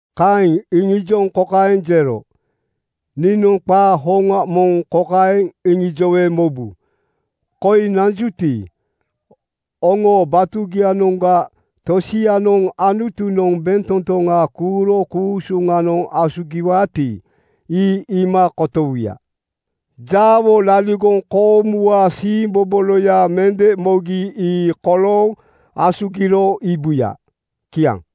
Kaeŋ iŋijoŋ kokaeŋ jero, “Niinoŋ qaa hoŋa moŋ kokaeŋ iŋijowe mobu: Koi nanjuti, oŋoo batugianoŋga tosianoŋ Anutunoŋ bentotoŋa kuuro ku-usuŋanoŋ asugiwaati, ii iima kotowuya. Jaawo laligoŋ koomuwaa siimboboloya mende mogi ii kolooŋ asugiro iibuya.” Kiaŋ.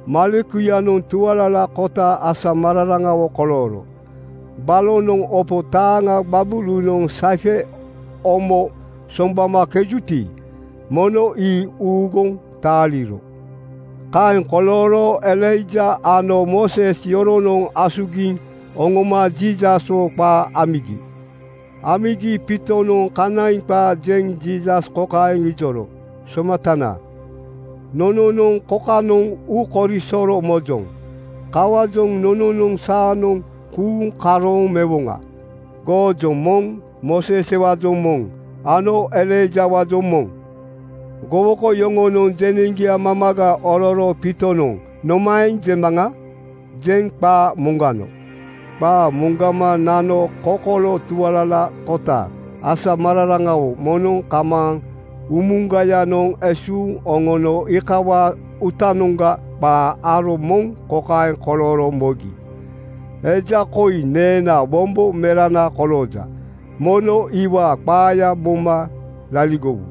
Malekuyanoŋ tualalakota asamararaŋawo kolooro. Balonoŋ opo taaŋa gbabulunoŋ (saife, omo) soŋgbamakejuti, mono ii uuguŋ taaliro. Kaeŋ kolooro Elaija ano Mooses yoronoŋ asugiŋ oŋoma Jiisaswo qaa amigi. Amigi Piitonoŋ kanaiŋ qaa jeŋ Jiisas kokaeŋ ijoro, “Somatanana, nononoŋ kokanoŋ uukorisoro mojoŋ. Kawaajoŋ nononoŋ saanoŋ kuuŋ karooŋ mewoŋa: Goojoŋ moŋ, Mooseswaajoŋ moŋ ano Elaijawaajoŋ moŋ.” Gowoko yoŋonoŋ jeneŋgia mamaga ororo Piitonoŋ “Nomaeŋ jemaŋa?” jeŋ qaa moŋgano. Qaa moŋgama nano kokolo tualalakota asamararaŋawo moŋnoŋ kamaaŋ umugayanoŋ esuuŋ oŋono iikawaa uutanoŋga qa aro moŋ kokaeŋ kolooro mogi, “Eja koi neenaa wombo merana kolooja. Mono iwaa qaaya moma laligowu.”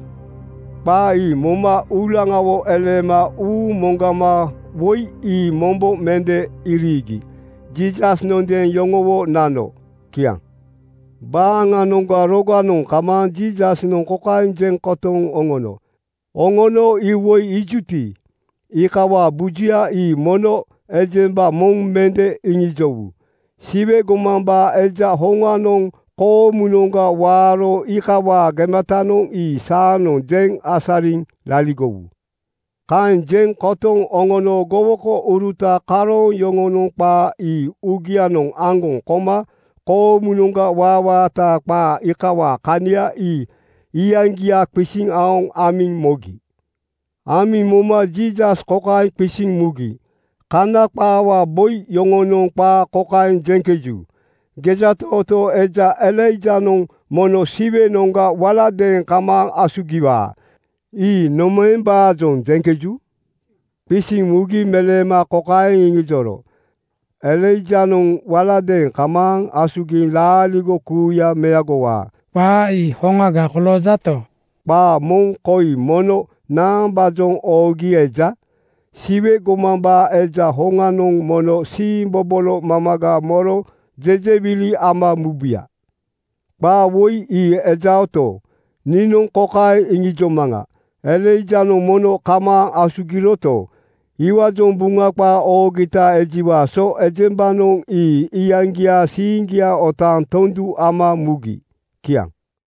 Qaa ii moma uulaŋawo eleema uuŋ moŋgama woi ii mombo mende iriigi Jiisasnondeeŋ yoŋowo nano. Kiaŋ. Baaŋanoŋga roganoŋ kamaaŋ Jiisasnoŋ kokaeŋ jeŋ kotoŋ oŋono, “Oŋono iwoi iijuti, iikawaa bujuya ii mono ejemba moŋ mende iŋijowu. Siwe gomambaa Eja hoŋanoŋ koomunoŋga waaro iikawaa gematanoŋ ii saanoŋ jeŋ asariŋ laligowu.” Kaeŋ jeŋ kotoŋ oŋono gowokouruta karooŋ yoŋonoŋ qaa ii uugianoŋ aŋgoŋ koma koomunoŋga waawaataa qaa iikawaa kania ii iyaŋgia qisiŋ aoŋ amiŋ mogi. Amiŋ moma Jiisas kokaeŋ qisiŋ mugi, “Kana qaawaa boi yoŋonoŋ qaa kokaeŋ jeŋkeju, ‘Gejatootoo eja Elaijanoŋ mono Siwenoŋga waladeeŋ kamaaŋ asugiwaa.’ Ii nomaembaajoŋ jeŋkeju?” Qisiŋ mugi meleema kokaeŋ iŋijoro, “Elaijanoŋ waladeeŋ kamaaŋ asugiŋ laaligo kuuya meagowaa. Qaa ii hoŋaga koloojato, qaa moŋ koi mono naambaajoŋ oogi eja: ‘Siwe gomambaa Eja hoŋanoŋ mono siimbobolo mamaga moro jejewili ama mubuya.’ Qaa woi ii ejaoto, niinoŋ kokaeŋ iŋijomaŋa: Elaijanoŋ mono kamaaŋ asugiroto, iwaajoŋ Buŋa qaa oogita ejiwaa so ejembanoŋ ii iyaŋgiaa siiŋgia otaaŋ tondu ama mugi.” Kiaŋ.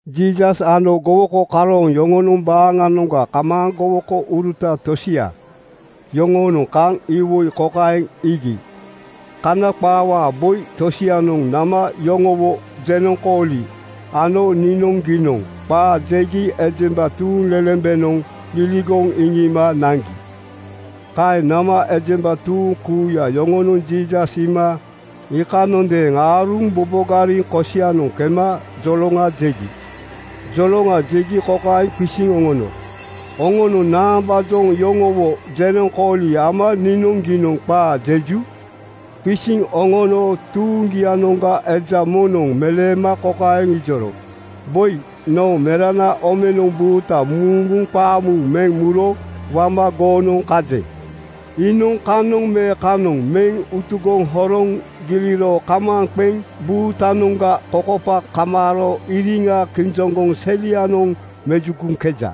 Jiisas ano gowoko karooŋ yoŋonoŋ baaŋanoŋga kamaaŋ gowokouruta tosia yoŋoonoŋ kaŋ iwoi kokaeŋ iigi: Kana qaawaa boi tosianoŋ nama yoŋowo jenoŋkooli ano niinoŋgiinoŋ qaa jegi ejemba tuuŋlelembenoŋ liligoŋ iŋiima naŋgi. Kaeŋ nama ejemba tuuŋ kuuya yoŋonoŋ Jiisas iima iikanondeeŋ aaruŋ bobogariŋ kosianoŋ kema joloŋa jegi. Joloŋa jegi kokaeŋ qisiŋ oŋono, “Oŋonoŋ naambaajoŋ yoŋowo jenoŋkooli ama niinoŋgiinoŋ qaa jeju?” Qisiŋ oŋono tuuŋgianoŋga eja moŋnoŋ meleema kokaeŋ ijoro, “Boi, noo merana omenoŋ buuta muuŋguŋ qaamuuŋ meŋ muro wama goonoŋ kajeŋ. Iinoŋ kanoŋ me kanoŋ meŋ utugoŋ horoŋ giliro kamaaŋ qeŋ buutanoŋga kokopa kamaaro iriŋa kijoŋgoŋ selianoŋ mejugoŋkeja.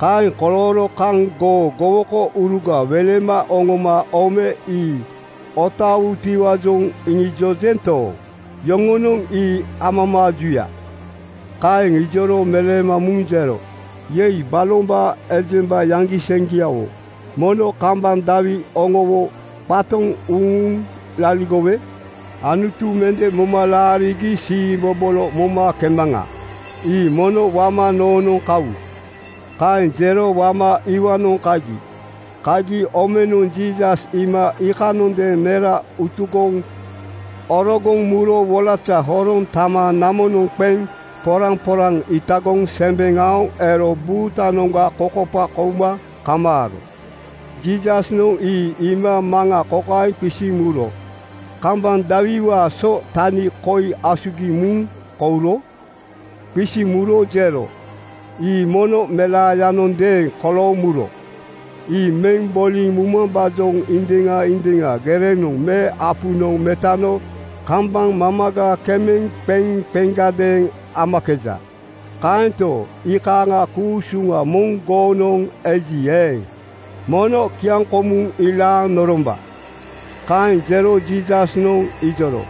Kaeŋ kolooro kaŋ goo gowokouruga welema oŋoma ome ii otaawutiwaajoŋ iŋijojento, yoŋonoŋ ii amamaajuya.” Kaeŋ ijoro meleema muŋ jero, “Yei! Balombaa ejemba yaŋgiseŋgiawo. Mono kambaŋ dawi oŋowo qatoŋ uŋuŋ laligowe Anutu mende moma laarigi siimbobolo momakemaŋa. Ii mono wama noonoŋ kawu.” Kaeŋ jero wama iwaanoŋ kagi. Kagi omenoŋ Jiisas iima iikanondeeŋ mera utugoŋ orogoŋ muro wolaza horoŋ tama namonoŋ qeŋ poraŋporaŋ itagoŋ sembeŋ aoŋ ero buutanoŋga kokopa kouma kamaaro. Jiisasnoŋ ii iima maŋa kokaeŋ qisiŋ muro, “Kambaŋ dawiwaa so tani koi asugiŋ muŋ kouro?” Qisiŋ muro jero, “Ii mono melaayanondeeŋ kolooŋ muro. “Ii meŋ boliŋ mumambaajoŋ indiŋa indiŋa gerenoŋ me apunoŋ metano kambaŋ mamaga kemeŋ qeŋ qeŋgadeeŋ amakeja. Kaento, iikaaŋaa ku-usuŋa moŋ goonoŋ eji eeŋ, mono kiaŋkomuŋ ilaaŋ noromba.” Kaeŋ jero Jiisasnoŋ ijoro,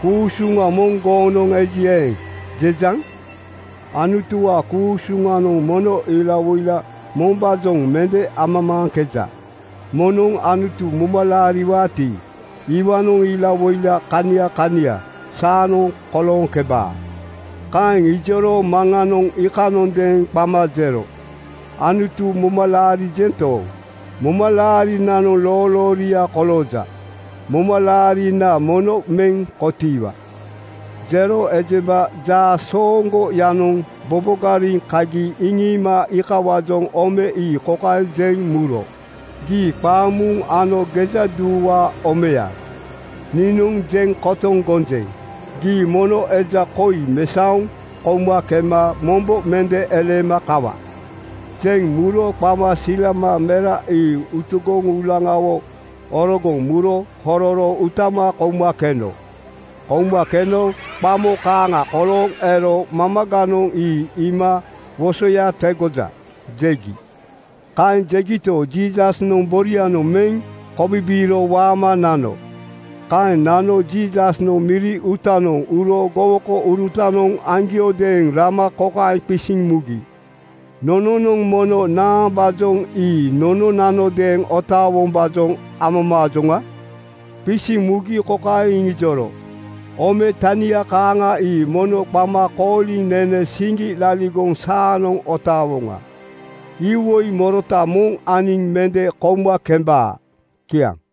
“‘Ku-usuŋa moŋ goonoŋ eji eeŋ,’ jejaŋ. Anutuwaa ku-usuŋanoŋ mono ilawoila mombaajoŋ mende amamaaŋkeja. Moŋnoŋ Anutu moma laariwaati, iwaanoŋ ilawoila kania kania saanoŋ kolooŋkebaa.” Kaeŋ ijoro maŋanoŋ iikanondeeŋ qama jero, “Anutu moma laarijento, momalaarinanoŋ loolooria kolooja. Momalaarina mono meŋ kotiiwa.” Jero ejemba jaasooŋgoyanoŋ bobogariŋ kagi iŋiima iikawaajoŋ ome ii kokaeŋ jeŋ muro, “Gii qaamuuŋ ano gejaduuwaa omeya, niinoŋ jeŋ kotoŋ gonjeŋ: Gii mono eja koi mesaoŋ kouma kema mombo mende eleema kawa.” Jeŋ muro qama silama mera ii utugoŋ uulaŋawo orogoŋ muro hororo utama kouma keno. Kouma keno qamo kaaŋa kolooŋ ero mamaganoŋ ii iima “Wosoya tegoja!” jegi. Kaeŋ jegito, Jiisasnoŋ borianoŋ meŋ kobibiiro waama nano. Kaeŋ nano Jiisasnoŋ miri uutanoŋ uro gowokourutanoŋ aŋgiodeeŋ rama kokaeŋ qisiŋ mugi, “Nononoŋ mono naambaajoŋ ii nononanodeeŋ otaawombaajoŋ amamaajoŋa?” Qisiŋ mugi kokaeŋ iŋijoro, “Ome tania kaaŋa ii mono qama kooliŋ nene siŋgi laligoŋ saanoŋ otaawoŋa. Iwoi morota moŋ aniŋ mende kouma kembaa.” Kiaŋ.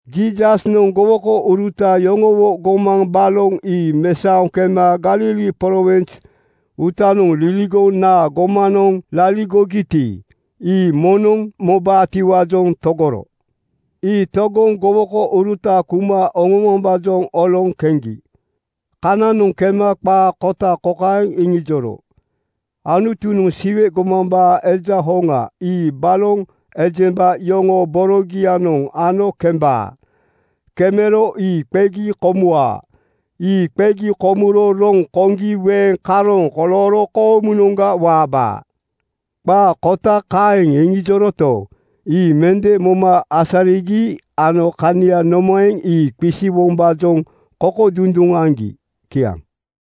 Jiisasnoŋ gowokouruta yoŋowo gomaŋ baloŋ ii mesaoŋ kema Galili prowins uutanoŋ liligoŋ naa gomanoŋ laligogiti, ii moŋnoŋ mobaatiwaajoŋ togoro. Ii togoŋ gowokouruta kuma oŋomambaajoŋ oloŋ keŋgi. Kananoŋ kema qaa kota kokaeŋ iŋijoro, “Anutunoŋ Siwe gomambaa Eja hoŋa ii baloŋ ejemba yoŋoo borogianoŋ ano kemebaa. Kemero ii qegi komuwaa. Ii qegi komuro roŋ koŋgi weeŋ karooŋ kolooro koomunoŋga waabaa.” Qaa kota kaeŋ iŋijoroto, ii mende moma asarigi ano kania nomaeŋ, ii qisiwombaajoŋ kokodunduŋ aŋgi. Kiaŋ.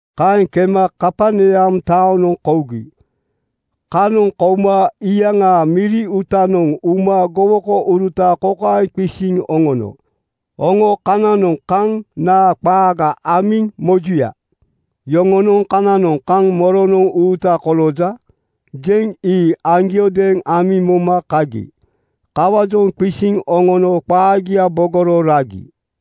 Kaeŋ kema Kaperneam taonoŋ kougi. Kanoŋ kouma iyaŋaa miri uutanoŋ uma gowokouruta kokaeŋ qisiŋ oŋono, “Oŋo kananoŋ kaŋ naa qaaga amiŋ mojuya?” Yoŋonoŋ kananoŋ kaŋ ‘Moronoŋ uuta kolooja?’ jeŋ ii aŋgiodeeŋ amiŋ moma kagi. Kawaajoŋ qisiŋ oŋono qaagia bogoro ragi.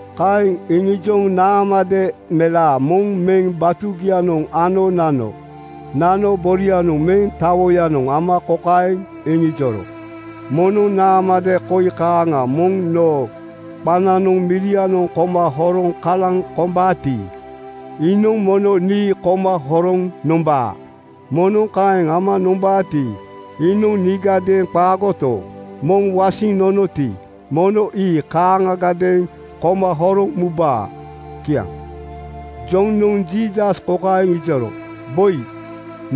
Kaeŋ iŋijoŋ naamade melaa moŋ meŋ batugianoŋ ano nano. Nano borianoŋ meŋ tawoyanoŋ ama kokaeŋ iŋijoro, “Moŋnoŋ naamade koi kaaŋa moŋ noo qananoŋ mirianoŋ koma horoŋ kalaŋ kombaati, iinoŋ mono nii koma horoŋ nombaa. Moŋnoŋ kaeŋ ama nombaati, iinoŋ niigadeeŋ qaagoto, moŋ wasiŋ nonoti, mono ii kaaŋagadeeŋ koma horoŋ mubaa.” Kiaŋ. Jonoŋ Jiisas kokaeŋ ijoro, “Boi,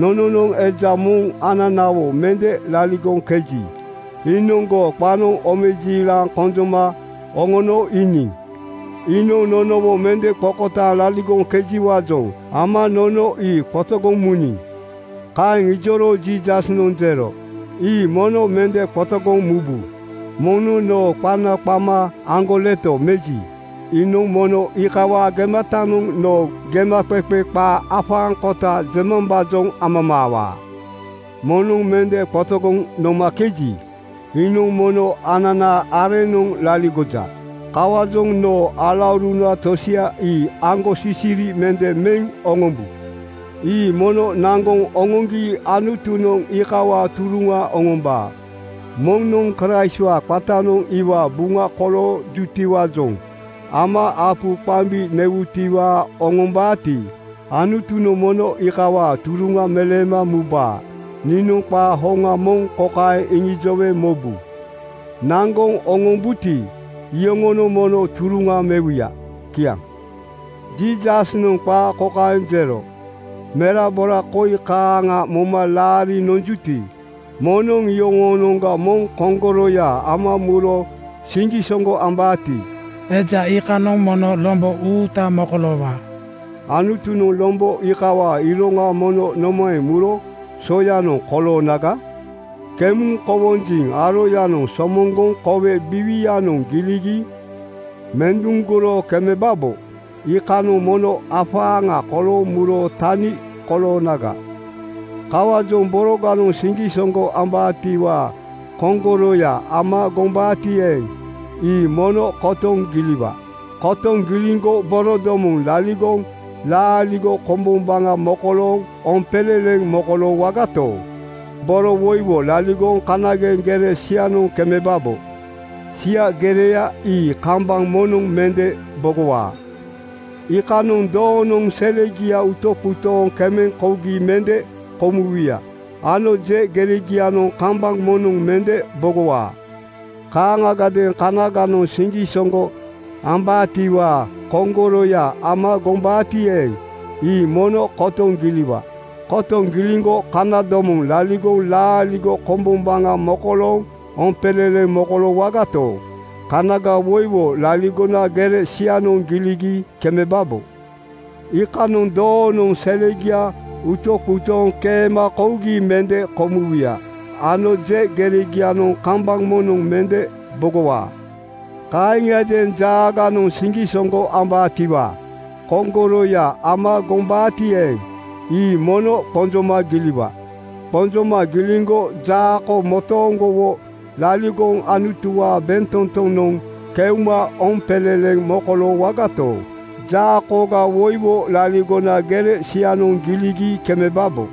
nononoŋ eja moŋ ananawo mende liligoŋkeji, iinoŋ goo qanoŋ omejiilaŋ konjoma oŋono iiniŋ. Iinoŋ nonowo mende qokotaaŋ laligoŋkejiwaajoŋ ama nono ii qotogoŋ muniŋ.” Kaeŋ ijoro Jiisasnoŋ jero, “Ii mono mende qotogoŋ mubu. Moŋnoŋ noo qana qama aŋgoleto meji, iinoŋ mono iikawaa gematanoŋ noo gemaqeqe qaa afaaŋkota jemambaajoŋ amamaawaa. Moŋnoŋ mende qotogoŋ nonomakeji, iinoŋ mono ananaa areŋnoŋ laligoja. (Kawaajoŋ noo alauruna tosia ii aŋgosisiri mende meŋ oŋombu.) Ii mono naŋgoŋ oŋoŋgi Anutunoŋ iikawaa turuŋa oŋombaa. Moŋnoŋ Kraistwaa qatanoŋ iwaa buŋa koloojutiwaajoŋ ama apu qambi newutiwaa oŋombaati, Anutunoŋ mono iikawaa turuŋa meleema mubaa. Niinoŋ qaa hoŋa moŋ kokaeŋ iŋijowe mobu: Naŋgoŋ oŋombuti, iyoŋonoŋ mono turuŋa mewuya.” Kiaŋ. Jiisasnoŋ qaa kokaeŋ jero, “Merabora koi kaaŋa moma laariŋ nonjuti, moŋnoŋ iyoŋoonoŋga moŋ koŋgoroya ama muro siŋgisoŋgo ambaati, eja iikanoŋ mono lombo uuta mokoloowaa. Anutunoŋ lombo iikawaa iroŋa mono nomaeŋ muro soyanoŋ koloonaga? Kemuŋ kowonjiŋ aroyanoŋ somoŋgoŋ kowe biiwianoŋ giligi menduŋgoro kemebabo, iikanoŋ mono afaaŋa kolooŋ muro tani koloonaga. Kawaajoŋ boroganoŋ siŋgisoŋgo ambaatiwaa koŋgoroya ama gombaati eeŋ, ii mono kotoŋ giliwa. Kotoŋ giliŋgo borodomoŋ laligoŋ laaligo kombombaŋa mokolooŋ oompeleleŋ mokoloowagato, boroga woiwo laligoŋ kanageŋ gere sianoŋ kemebabo. Sia gereya ii kambaŋ moŋnoŋ mende bogowaa. Iikanoŋ ‘Doonoŋ selegia utoqutooŋ keema kougi mende komuwuya ano je geregianoŋ kambaŋ moŋnoŋ mende bogowaa.’ “Kaaŋagadeeŋ kanaganoŋ siŋgisoŋgo ambaatiwaa koŋgoroya ama gombaati eeŋ, ii mono kotoŋ giliwa. Kotoŋ giliŋgo kanadomoŋ laligoŋ laaligo kombombaŋa mokolooŋ oompeleleŋ mokoloowagato, kanaga woiwo laligona gere sianoŋ giligi kemebabo. Iikanoŋ ‘Doonoŋ selegia utoqutooŋ keema kougi mende komuwuya ano je geregianoŋ kambaŋ moŋnoŋ mende bogowaa.’ “Kaaŋiadeeŋ jaaganoŋ siŋgisoŋgo ambaatiwaa koŋgoroya ama gombaati eeŋ, ii mono qonjoma giliwa. Qonjoma giliŋgo jaako motooŋgowo laligoŋ Anutuwaa bentotonoŋ keuma oompeleleŋ mokoloowagato, jaakoga woiwo laligona gere sianoŋ giligi kemebabo.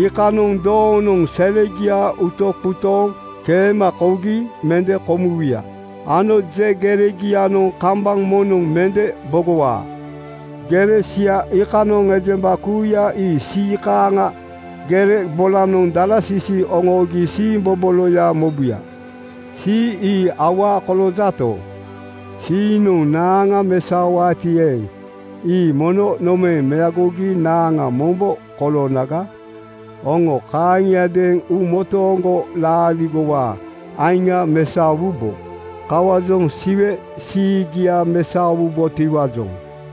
Iikanoŋ ‘Doonoŋ selegia utoqutooŋ keema kougi mende komuwuya ano je geregianoŋ kambaŋ moŋnoŋ mende bogowaa.’ “Gere sia iikanoŋ ejemba kuuya ii sii kaaŋa gere bolanoŋ dalasisi oŋoogi siimboboloya mobuya. “Sii ii awaa koloojato, siinoŋ naaŋa mesaowaati eeŋ, ii mono nomaeŋ meagogi naaŋa mombo koloonaga? Oŋo kaaŋiadeeŋ uumotooŋgo laaligowaa aiŋa mesaowubo. Kawaajoŋ Siwe siigia mesaowubotiwaajoŋ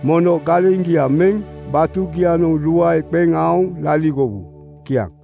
mono galeŋgia meŋ batugianoŋ luae qeŋ aoŋ laligowu.” Kiaŋ.